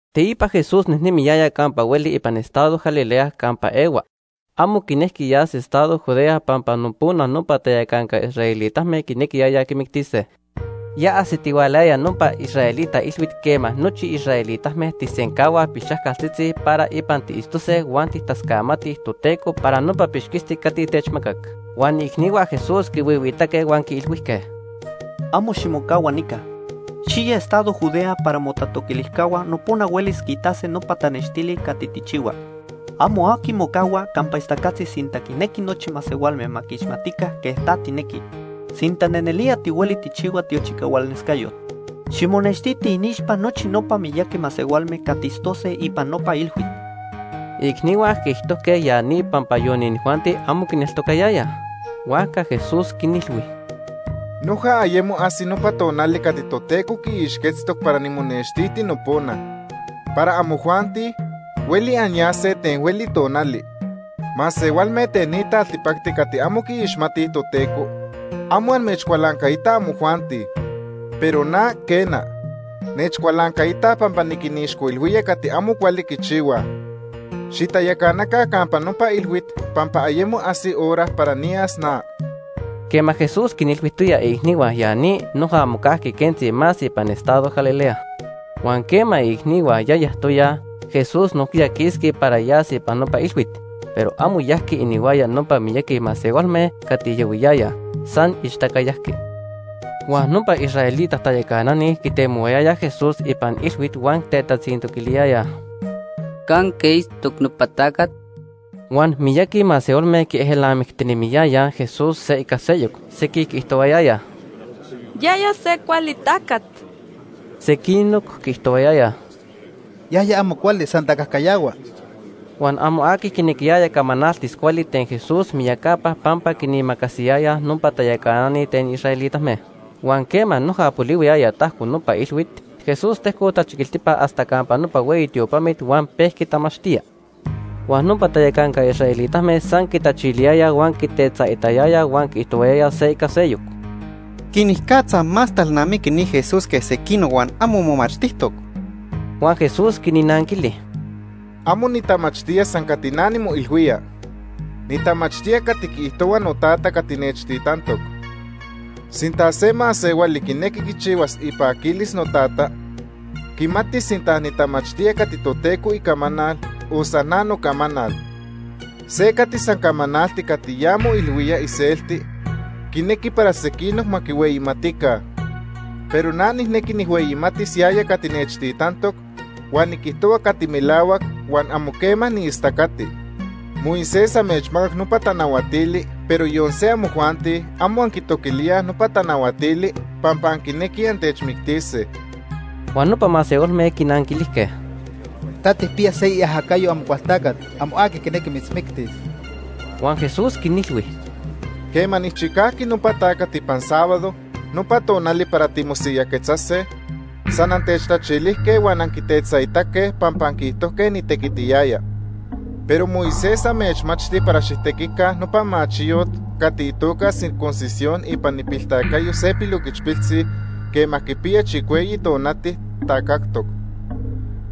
Teipa Jesús nejnemiyaya campa hueli ipan estado Galilea campa ehua. Amo quinejqui yas estado Judea pampa nopona nopa tayacanca israelitame quinequiyayaj quimictise. Ya ajsitihualayaya nopa israelita ilhuit quema nochi israelitame tijsencahuaj pilxajcaltzitzi para ipan tiitztose huan tijtascamatij Toteco para nopa pixquisti cati techmacac. Huan iicnihua Jesús quihuihuiitaque huan quiilhuijque: ―Amo ximocahua nica. Xiya estado Judea para motatoquilijcahua nopona huelis quiitase nopa tanextili cati tijchihua. Amo aqui mocahua campa ixtacatzi sinta quinequi nochi masehualme ma quiixmatica quej ta tijnequi. Sinta nelnelía tihueli tijchihua tiochicahualnescayot, ximonextiti iniixpa nochi nopa miyaqui masehualme cati itztose ipan nopa ilhuit. Iicnihua quiijtojque ya ni pampa yon inijuanti, amo quineltocayayaj. Huajca Jesús quinilhui: ―Noja ayemo ajsi nopa tonali cati Toteco quiixquetztoc para nimonextiti nopona. Para amojuanti, hueli anyase ten hueli tonali. Masehualme ten ni taltipacti cati amo quiixmatij Toteco, amo amechcualancaitaj amojuanti. Pero na, quena, nechcualancaitaj pampa niquinixcoilhuía cati amo cuali quichihuaj. Xitayacanaca campa nopa ilhuit pampa ayemo ajsi hora para niyas na. Quema Jesús quinilhuijtoya iicnihua ya ni, noja mocajqui quentzi más ipan estado Galilea. Huan quema iicnihua ya yajtoyaj, Jesús nojquiya quisqui para yas ipan nopa ilhuit. Pero amo yajqui inihuaya nopa miyaqui masehualme cati yahuiyayaj, san ixtaca yajqui. Huan nopa israelita tayacanani quitemohuayayaj Jesús ipan ilhuit huan tetatzintoquiliyayaj: ―¿Canque itztoc nopa tacat? Huan miyaqui masehualme quiejelnamictinemiyayaj Jesús se ica seyoc. Sequij quiijtohuayayaj: “Yaya se cuali tacat.” Sequinoc quiijtohuayayaj: “Yaya amo cuali, san tacajcayahua.” Huan amo aqui quinequiyaya camanaltis cuali ten Jesús miyacapa pampa quinimacasiyayaj nopa tayacanani ten israelitame. Huan quema noja polihuiyaya tajco nopa ilhuit, Jesús tejcoc tachiquiltipa hasta campa nopa hueyi tiopamit huan pejqui tamachtía. Huan nopa tayacanca israelitame san quitachiliyayaj huan quitetzaitayayaj huan quiijtohuayayaj se ica seyoc: ―¿Quenicatza más talnamiqui ni Jesús que sequinoc huan amo momachtijtoc? Huan Jesús quinnanquili: ―Amo nitamachtía san cati na nimoilhuía. Nitamachtía cati quiijtohua noTata cati nechtitantoc. Sinta se masehuali quinequi quichihuas ipaquilis noTata, quimatis sinta nitamachtía cati Toteco icamanal o san na nocamanal. Se cati san camanalti cati ya moilhuía iselti quinequi para sequinoc ma quihueyimatica. Pero na nijnequi nijhueyimatis yaya cati nechtitantoc, huan niquijtohua cati melahuac huan amo quema niistacati. “Moisés amechmacac nopa tanahuatili, pero yon se amojuanti amo anquitoquilíaj nopa tanahuatili pampa anquinequij antechmictise.” Huan nopa masehualme quinanquilijque: ―Ta tijpiya se iajacayo Amocualtacat. Amo aqui quinequi mitzmictis. Huan Jesús quinilhui: ―Quema nijchicajqui nopa tacat ipan sábado nopa tonali para timosiyajquetzase, san antechtachilijque huan anquitetzaitaque pampa anquiijtojque nitequitiyaya. Pero Moisés amechmachti para xijtequica nopa machiyot cati itoca circuncisión ipan ipiltacayo se piloquichpiltzi quema quipiya chicueyi tonati tacajtoc.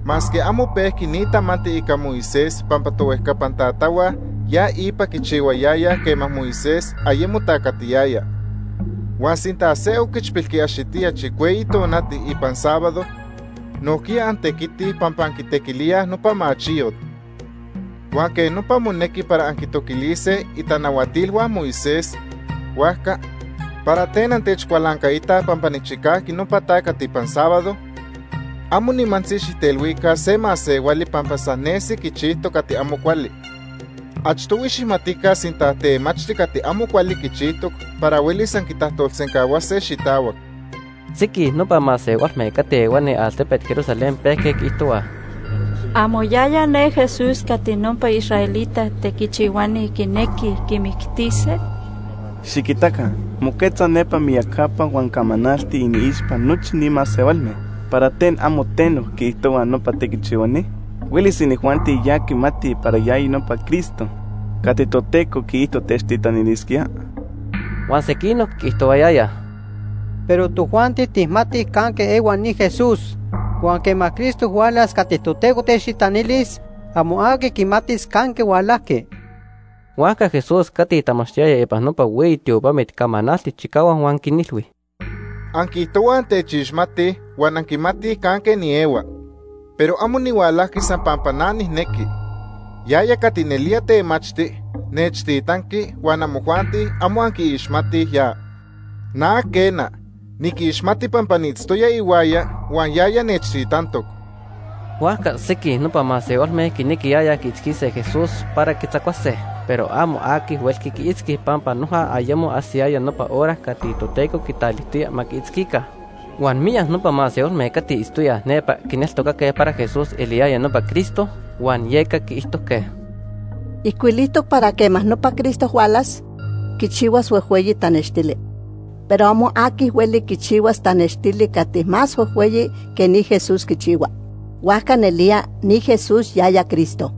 (Masque amo pejqui ni tamanti ica Moisés pampa tohuejcapan tatahua ya ipa quichihuayayaj quema Moisés ayemo tacatiyaya.) Huan sinta se oquichpil quiaxitía chicueyi tonati ipan sábado, nojquiya antequitij pampa anquitequilíaj nopa machiyot. Huan quej nopa monequi para anquitoquilise itanahuatilhua Moisés, huajca ¿para ten antechcualancaitaj pampa nijchicajqui nopa tacat ipan sábado? Amo nimantzi xijtelhuica se masehuali pampa san nesi quichijtoc cati amo cuali. Achtohui xijmatica sinta temachti cati amo cuali quichijtoc para huelis anquitajtolsencahuase xitahuac. Sequij nopa masehualme cati ehuani altepet Jerusalén pejque quiijtohuaj: ―¿Amo yaya ne Jesús cati nopa israelita tequichihuani quinequij quimictise? Xiquitaca, moquetza nepa miyacapa huan camanalti iniixpa nochi ni masehualme. ¿Para ten amo teno quiijtohuaj nopa tequichihuani? ¿Huelis inijuanti ya quimatij para yaya nopa Cristo cati Toteco quiijto techtitanilisquía? Huan sequinoc quiijtohuayayaj: ―Pero tojuanti tijmatij canque ehua ni Jesús, huan quema Cristo hualas cati Toteco techtitanilis, amo aqui quimatis canque hualajqui. Huajca Jesús cati tamachtiyaya ipan nopa hueyi tiopamit camanaltic chicahuac huan quinilhui: ―Anquiijtohuaj antechixmatij huan anquimatij canque niehua. Pero amo nihualajqui san pampa na nijnejqui. Yaya cati nelía temachti nechtitanqui huan amojuanti amo anquiixmatij ya. Na quena, niquixmati pampa niitztoya ihuaya huan yaya nechtitantoc. Huajca sequij nopa masehualme quinequiyayaj quiitzquise Jesús para quitzacuase, pero amo aqui huelqui quiitzqui pampa noja ayemo ajsiyaya nopa hora cati Toteco quitalijtoya ma quiitzquica. Huan miyac nopa masehualme cati itztoyaj nepa quineltocaque para Jesús eliyaya nopa Cristo, huan yeca quiijtojque: ―Ijcuilijtoc para quema nopa Cristo hualas, quichihuas huejhueyi tanextili. Pero amo aqui hueli quichihuas tanextili cati más huejhueyi que ni Jesús quichihua. Huajca nelía ni Jesús yaya Cristo.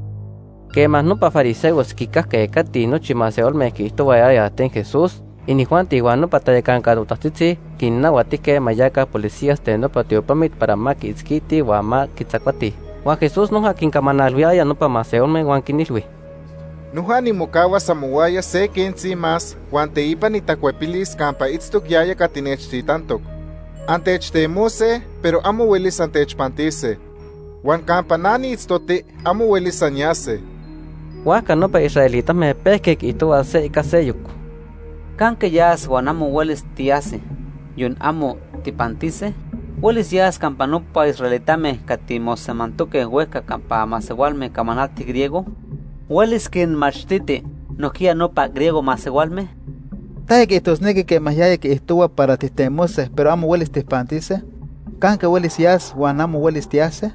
Quema nopa fariseos quicajque cati nochi masehualme quiijtohuayayaj ten Jesús, inijuanti huan nopa tayacanca totajtzitzi quinnahuatijque ma yaca policías ten nopa tiopamit para ma quiitzquitij huan ma quitzacuatij. Huan Jesús noja quincamanalhuiyaya nopa masehualme huan quinilhui: ―Noja nimocahuas amohuaya se quentzi más huan teipa nitacuepilis campa itztoc yaya cati nechtitantoc. Antechtemose, pero amo huelis antechpantise. Huan campa na niitztoti amo huelis anyase. Huajca nopa israelitame pejque quiijtohuaj se ica seyoc: ―¿Canque yas huan amo huelis tiyase, yon amo tijpantise? ¿Huelis yas campa nopa israelitame cati mosemantoque huejca campa masehualme camanaltij griego? ¿Huelis quinmachtiti nojquiya nopa griego masehualme? ¿Taya quiijtosnequi quema yaya quiijtohua para tijtemose, pero amo huelis tijpantise? ¿Canque huelis yas huan amo huelis tiyase?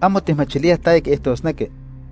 Amo tijmachilíaj taya quiijtosnequi.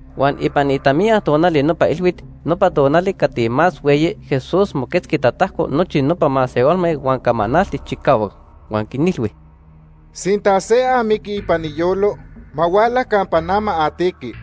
Huan ipan itamiya tonali nopa ilhuit, nopa tonali cati más hueyi, Jesús moquetzqui tatajco nochi nopa masehualme huan camanaltic chicahuac. Huan quinilhui: ―Sinta se amiqui ipan iyolo, ma huala campa na ma atiqui.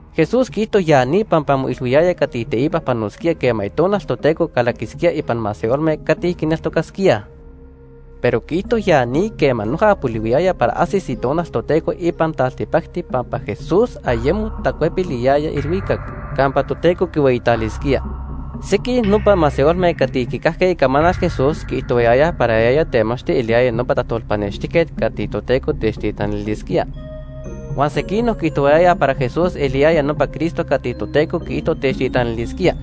Jesús quiijto ya ni pampa moilhuiyaya cati teipa panosquía quema Itonal Toteco calaquisquía ipan masehualme cati quineltocasquíaj. Pero quiijto ya ni quema noja polihuiyaya para ajsis Itonal Toteco ipan taltipacti pampa Jesús ayemo tacuepiliyaya ilhuicac campa Toteco quihueyitalisquía. Sequij nopa masehualme cati quicajque icamanal Jesús quiijtohuayayaj para yaya temachti eliyaya nopa tajtolpanextijquet cati Toteco techtitanilisquía. Huan sequinoc quiijtohuayayaj para Jesús eliyaya nopa Cristo cati Toteco quiijto techtitanilisquía.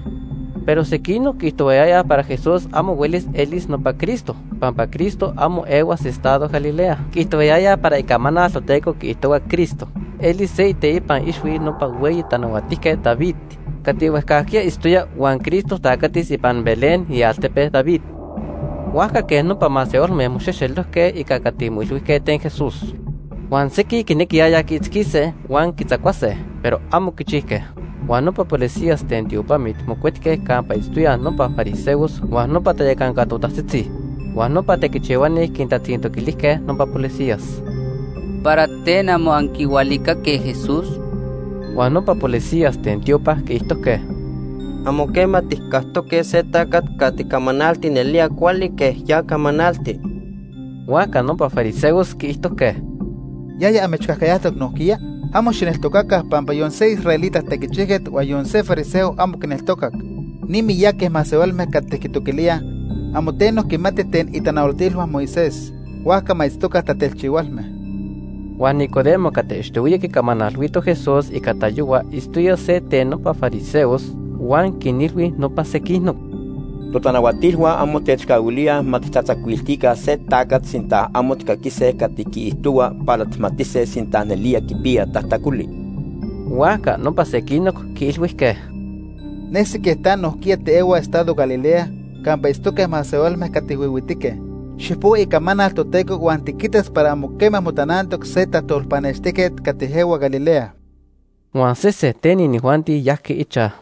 Pero sequinoc quiijtohuayayaj para Jesús amo huelis elis nopa Cristo, pampa Cristo amo ehuas estado Galilea. Quiijtohuayayaj para Icamanal Toteco quiijtohua Cristo elis se iteipan ixhui nopa hueyi tanahuatijquet David cati huejcajquiya itztoya huan Cristo tacatis ipan Belén, ialtepe David. Huajca quej nopa masehualme moxejxelojque ica cati moilhuijque ten Jesús. Huan sequij quinequiyayaj quiitzquise huan quitzacuase, pero amo quichijque. Huan nopa policías ten tiopamit mocuetque campa itztoyaj nopa fariseos huan nopa tayacanca totajtzitzi. Huan nopa tequichihuani quintatzintoquilijque nopa policías: ―¿Para ten amo anquihualicaque Jesús? Huan nopa policías ten tiopa quiijtojque: ―Amo quema tijcactoque se tacat cati camanalti nelía cuali quej ya camanalti. Huajca nopa fariseos quiijtojque: ―¿Yaya amechcajcayajtoc nojquiya? Amo xijneltocaca pampa yon se israelita tequichijquet huan yon se fariseo amo quineltocac. Ni miyaqui masehualme cati quitoquilíaj, amo teno quimatij ten itanahuatilhua Moisés, huajca ma itztoca tatelchihualme. Huan Nicodemo cati achtohuiya quicamanalhuito Jesús ica tayohua itztoya se ten nopa fariseos huan quinilhui nopa sequinoc: ―Totanahuatilhua amo techcahuilíaj ma tijtatzacuiltica se tacat sinta amo tijcaquise cati quiijtohua para tijmatise sinta nelía quipiya tajtacoli. Huajca nopa sequinoc quiilhuijque: ―Nesi quej ta nojquiya tiehua estado Galilea campa itztoque masehualme cati huihuitique. Xijpohua Icamanal Toteco huan tiquitas para amo quema motanantoc se tajtolpanextijquet cati ehua Galilea. Huan sese ten inijuanti yajqui ichaj.